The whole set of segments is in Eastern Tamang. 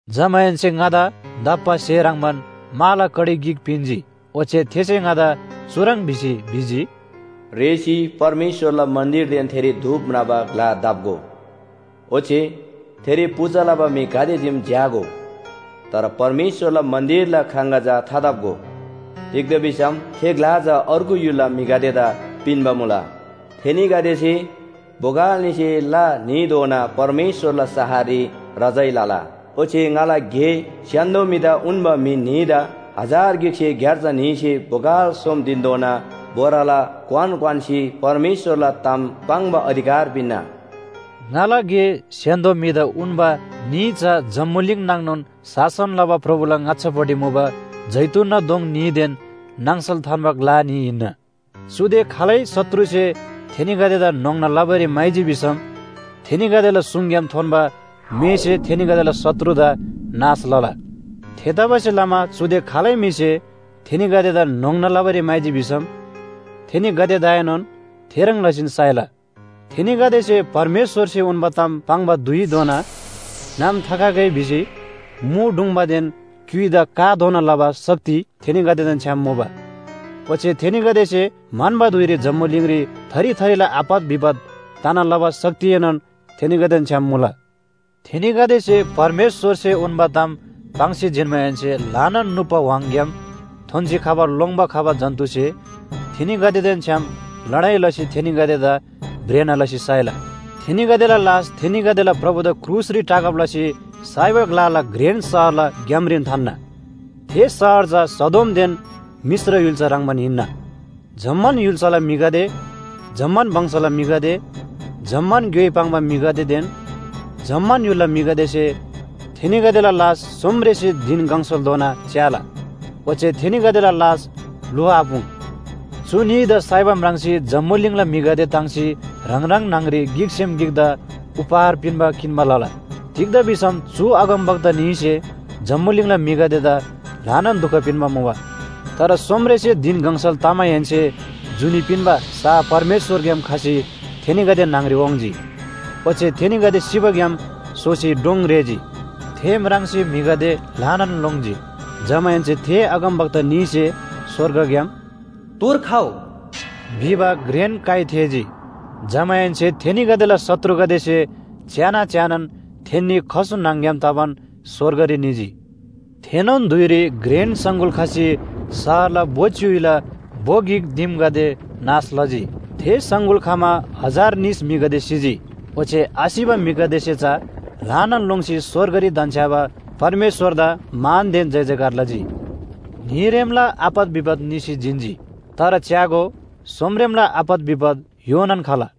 जमाहेन्‍से ङादा दप्‍बा स्‍हे ह्रङ्‌बान माला कडी गिक पिन्‍जी। ओच्‍छे थेसे ङादा चुह्रङ् भिसी भिजी, “रेःसी परमेश्‍वरला मन्‍दिरदेन थेरी धूप म्राबा ग्‍ला दप्‍गो। ओच्‍छे थेरी पूजा लबा म्‍हि गाते चीम झ्‍यागो। तर परमेश्‍वरला मन्‍दिरला ख्राङगा चा थादप्‍गो। तिग्‍दा भिसम थे ग्‍ला चा अर्गु य्‍हुलला म्‍हिगदेदा पिन्‍बा मुला। थेनीगदेसे बोगल न्‍हीसे ला न्‍हीधोना परमेश्‍वरला शहररी रजाइँ लला। ओच्‍छे ङाला गे स्‍य्‍हान्‍दो म्‍हिदा उन्‍बा म्‍हि न्‍हीदा हजार गिकसे ग्‍यार्जा न्‍हीसे बोगल सोम धिनधोना बोराला क्‍वान क्‍वान्‍सी परमेश्‍वरला ताम पाङ्बा अधिकार पिन्‍ना।” ङाला गे स्‍य्‍हान्‍दो म्‍हिदा उन्‍बा न्‍ही चा जम्‍बुलिङ नाङनोन शासन लबा प्रभुला ङाच्‍छापट्टि मुबा जैतूनना दोङ न्‍हीदेन नाङसल थान्‍बा ग्‍ला न्‍ही हिन्‍ना। चुदे खालै शत्रुसे थेनीगदेदा न्‍होङ्ना लबारी म्‍हाइजी भिसम थेनीगदेला सुङग्‍याम थोन्‍बा मेसे थेनीगदेला शत्रुदा नाश लला। थेतबासेलमा चुदे खालै म्‍हिसे थेनीगदेदा न्‍होङ्ना लबारी म्‍हाइजी भिसम थेनीगदेदाएनोन थेह्रङ् लसीन साइला। थेनीगदेसे परमेश्‍वरसे उन्‍बा ताम पाङ्बा धुइधोना नाम थाखगै भिसी मु ढुङ्‌बादेन क्‍युइदा काधोना लबा शक्ति थेनीगदेदेन छ्‌याम मुला। ओच्‍छे थेनीगदेसे म्‍हन्‍बा धुइरी जम्‍बुलिङरी थरी थरीला आपत विपत तना लबा शक्तिएनोन थेनीगदेदेन छ्‌याम मुला। थेनीगदेसे परमेश्‍वरसे उन्‍बा ताम पाङ्सी जिन्‍माहेन्‍से ल्‍हानान नुप्‍बा व्‍हाङग्‍याम थोन्‍सी खबा लोङ्‌बा खबा जन्‍तुसे थेनीगदेदेन छ्‌याम लडाइ लसी थेनीगदेदा भ्रेना लसी साइला। थेनीगदेला लास थेनीगदेला प्रभुदा क्रुसरी टाँगब लसी साइबा ग्‍लाला घ्रेन शहरला ग्‍यामरीन थान्‍ना। थे शहर चा सदोमदेन मिश्र य्‍हुल्‍सा ह्रङ्‌बान हिन्‍ना। जम्‍मान य्‍हुल्‍साला म्‍हिगदे, जम्‍मान वंशला म्‍हिगदे, जम्‍मान ग्‍योइ पाङ्बा म्‍हिगदेदेन जम्‍मान य्‍हुलला म्‍हिगदेसे थेनीगदेला लास सोमरेसे धिन गङसालधोना च्‍याला। ओच्‍छे थेनीगदेला लास ल्‍हुआपुङ। चु न्‍हीदा साइबा म्राङ्सी जम्‍बुलिङला म्‍हिगदे ताङ्सी ह्राङ ह्राङ न्‍हङरी गिकसेम गिकदा उपहार पिन्‍बा किन्‍बा लला। तिग्‍दा भिसम चु अगमवक्ता न्‍हीसे जम्‍बुलिङला म्‍हिगदेदा ल्‍हानान दुख पिन्‍बा मुबा। तर सोमरेसे धिन गङसल तमाहेन्‍से जुनी पिन्‍बा सा परमेश्‍वरग्‍याम खसी थेनीगदे न्‍हङरी वाङ्‌जी। ओच्‍छे थेनीगदे सिबाग्‍याम सोसी डोङ रेःजी, थे म्राङ्सी म्‍हिगदे ल्‍हानान लोङ्जी। जमाहेन्‍से थे अगमवक्ता न्‍हीसे स्‍वर्गग्‍याम “तोर खउ” भिबा घ्रेन काइ थेःजी। जमाहेन्‍से थेनीगदेला शत्रुगदेसे च्‍यान च्‍यानान थेन्‍नी खसु न्‍हङ‍ग्‍याम तबान स्‍वर्गरी निजी। थेनोन धुइरी घ्रेन सङगुल खसी शहरला भो च्‍युइला भो गिक दिमगदे नाश लजी। थे सङगुल खमा हजार निस म्‍हिगदे सिजी। ओच्‍छे आसिबा म्‍हिगदेसे चा ल्‍हानान लोङ्सी स्‍वर्गरी धन्‍छ्‌याबा परमेश्‍वरदा मानदेन जयजयकार लजी। न्‍हीरेमला आपत विपत निसी जिन्‍जी। तर च्‍यागो, सोमरेमला आपत विपत योनान खला।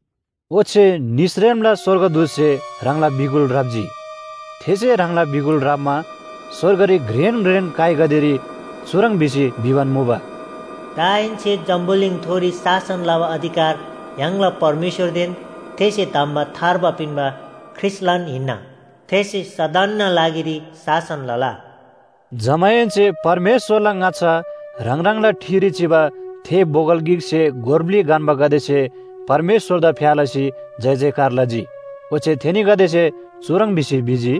ओच्‍छे निसरेमला स्‍वर्गदूतसे ह्राङला बिगुल ह्राप्‍जी। थेसे ह्राङला बिगुल ह्राप्‍मा स्‍वर्गरी घ्रेन घ्रेन काइगदेरी चुह्रङ् भिसी भिबान मुबा, “दाहेन्‍से जम्‍बुलिङथोरी शासन लबा अधिकार य्‍हाङला परमेश्‍वरदेन थेसे धम्‍बा थार्बा पिन्‍बा ख्रीष्‍टलान हिन्‍ना। थेसे सदनना लागिरी शासन लला।” जमाहेन्‍से परमेश्‍वरला ङाच्‍छा ह्राङ ह्राङला ठिरी चिबा थे बोगल गिकसे गोर ब्‍लि गन्‍बागदेसे परमेश्‍वरदा फ्‍या लसी जयजयकार लजी। ओच्‍छे थेनीगदेसे चुह्रङ् भिसी भिजी,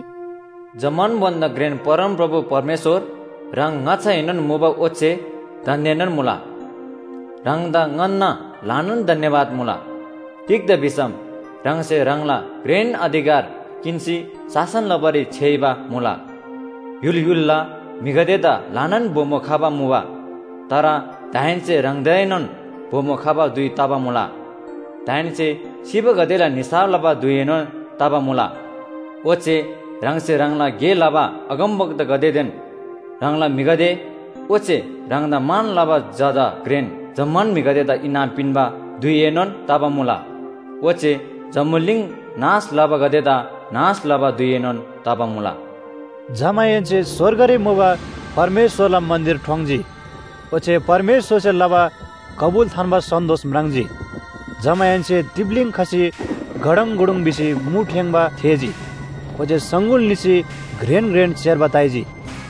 “जम्‍मान भन्‍दा घ्रेन परमप्रभु परमेश्‍वर, ह्राङ ङाच्‍छाएनोन मुबा ओच्‍छे दान्‍देनोन मुला। ह्राङदा ङन्‍ना ल्‍हानान धन्‍यवाद मुला। तिग्‍दा भिसम ह्राङसे ह्राङला घ्रेन अधिकार किन्‍सी शासन लबारी छ्‌याइबा मुला। य्‍हुल य्‍हुलला म्‍हिगदेदा ल्‍हानान बोमो खबा मुबा, तर दाहेन्‍से ह्राङदाएनोन बोमो खबा धुइ तबा मुला। दाहेन्‍से सिबागदेला निसाफ लबा धुइएनोन तबा मुला, ओच्‍छे ह्राङसे ह्राङला गे लबा अगमवक्तागदेदेन ह्राङला म्‍हिगदे, ओच्‍छे ह्राङदा मान लबा जजा घ्रेन जम्‍मान म्‍हिगदेदा इनाम पिन्‍बा धुइएनोन तबा मुला, ओच्‍छे जम्‍बुलिङ नाश लबागदेदा नाश लबा धुइएनोन तबा मुला।” जमाहेन्‍से स्‍वर्गरी मुबा परमेश्‍वरला मन्‍दिर ठोङ्‌जी। ओच्‍छे परमेश्‍वरसे लबा कबुल थान्‍बा सन्‍दोस म्राङ्जी। जमाहेन्‍से तिप्‍लीङ खसी गडङगुडुङ भिसी मु ठेङ्‌बा थेःजी। ओच्‍छे सङगुल निसी घ्रेन घ्रेन सेर्बा ताइजी।